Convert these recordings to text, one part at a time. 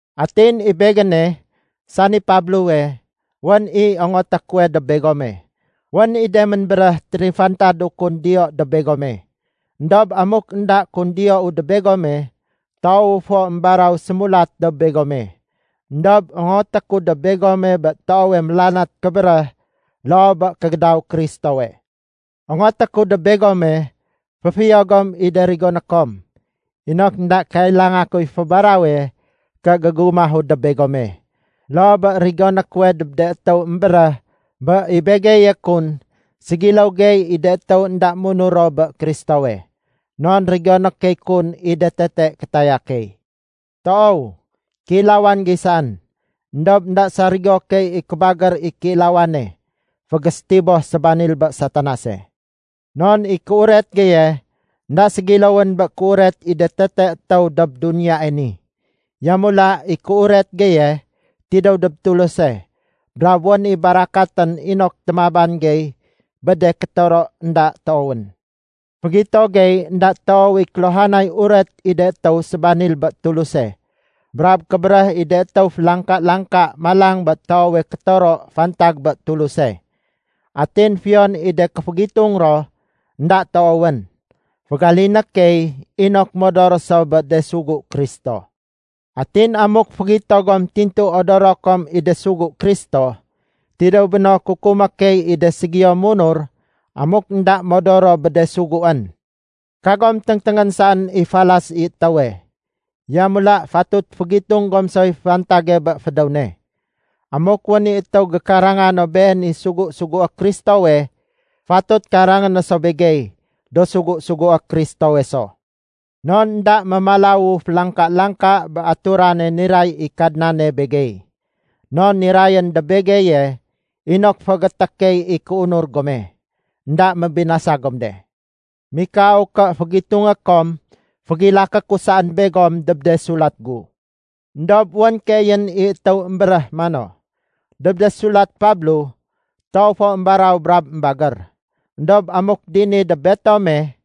Atin i begéne, sani Pablowe, wén i ongoté kuwe dob begome. Wén i de ménbéréh térifantadu kun ké diyou dob begome. Endob amuk énda kun diyou dob begome, toowu fo émbaraw sémulat dob begome. Endob ongoté ku dob begome bé toowe mélanat kébéréh loo bé kégédaw Kristowe. Ongoté ku dob begome, féfiyo gom i de rigoné kom inok énda kailanga kuy fébarawe ké gégumahu dob begome, loo bé rigoné kuwe dob de étéw émbéréh bé i begeye kun ségiléw gey i de étéw énda munur ro bé Kristowe. Non rigoné key kun i de tete kétaya key. Toow kéilawan gey saén, éndob énda sarigo key i kébagér i kéilawane fégésétiboh sébanil bé Satanase. Non i kéuret geye énda ségiléwén bé kéuret i de tete étéw dob duniyae ni. Yamula i kéuret geye tidéw dob Tuluse brab wén i barakatén inok témaban gey bé de kétoro énda toowén. Fégito gey énda toow i kéluhanay uret i de étéw sébanil bé Tuluse brab kébéréh i de étéw félangka-langka malang bé toowe kétoro fantag bé Tuluse. Atin fiyon i de kéfégitung ro énda toowén, fégaliné key inok modor so bé de sugu Kristo. Atin amuk fégito gom tintu odoro kom i de sugu Kristo, tidéw béno kukumé key i de ségiyo munur amuk énda modor ro bé de suguén. Kagom téngténgén saén i falas i étéwe, yamula fatut fégitung gom soy fantage bé fédéw ne. Amuk wén i étéw gékaranga no been i sugu-sugué Kristowe, fatut karangé no so begey, do sugu-sugué Kristowe so. Non énda mémalawu félangka-langka bé aturane niray i Kadnane begey. Non nirayén dob begeye inok féégété key i kéunur gome, énda mébinasa gom de. Mikau ké fégitungé kom fégilaké ku saén begom dob de sulat gu. Endob wén keeyén i étéw émbéréh mano, “Dob de sulat Pablo, toow fo émbaraw brab émbagér. Endob amuk dini dob betome,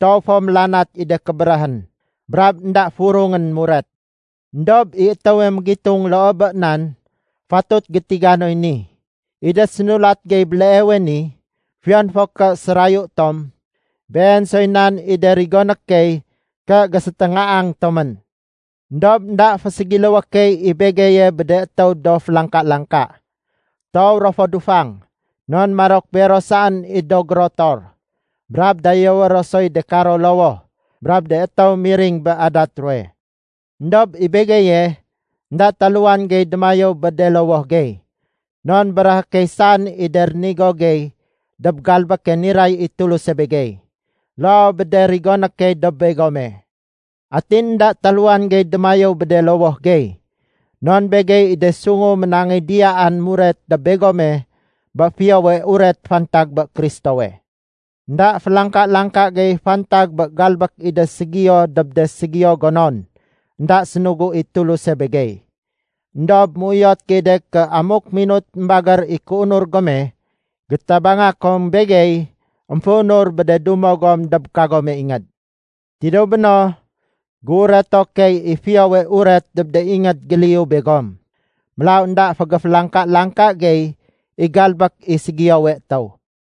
toow fo mélanat i de kébéréhén brab énda furungén muret.” Endob i étéwe mégitung loo bé nan, fatut gétiga noy ni. I de sénulat gey béleewe ni, fiyon fo ké sérayu tom, been soy nan i de rigoné key ké géséténgaang tomén. Endob énda féségiléwé key i begeye bé de étéw do félangka-langka. Toow ro fo dufang, non marok bero saén i do gérotor, brab dayéwé ro soy de karo lowoh brab de étéw miring bé adat ruwe. Endob i begeye, énda taluwan gey démayéw bé de lowoh gey, non béréhé key saén i de rénigo gey dob galbéke niray i Tuluse begey, loo bé de rigoné key dob begome. Atin énda taluwan gey démayéw bé de lowoh gey, non begey i de sungu ménangéy diyaan muret dob begome bé Fiyowe Uret fantag bé Kristowe. Enda félangka-langka gey fantag bé galbék i de ségiyo dob de ségiyo gonon énda sénugu i Tuluse begey. Endob méuyot gey de ké amuk minut émbagér i kéunur gome, gétabanga kom begey émféunur bé de dumo gom dob kagome ingéd. Tidéw béno, géureto key i Fiyowe Uret dob de ingéd géliyu begom. Mélaw énda fégéfélangka-langka gey i galbék i ségiyowe étéw.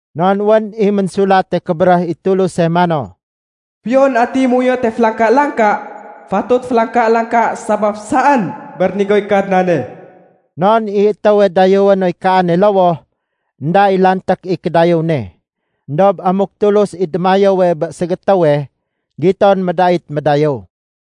Non wén i Ménsulate Kébéréh i Tuluse mano, “Fiyon atiy méuyote félangka-langka, fatut félangka-langka sabaf saén bé rénigoy Kadnane.” Non i étéwe dayéwé noy kaane lowoh, énda i lanték i kédayéw ne. Endob amuk Tulus i démayéwe bé ségétéwe, giton médait médayéw.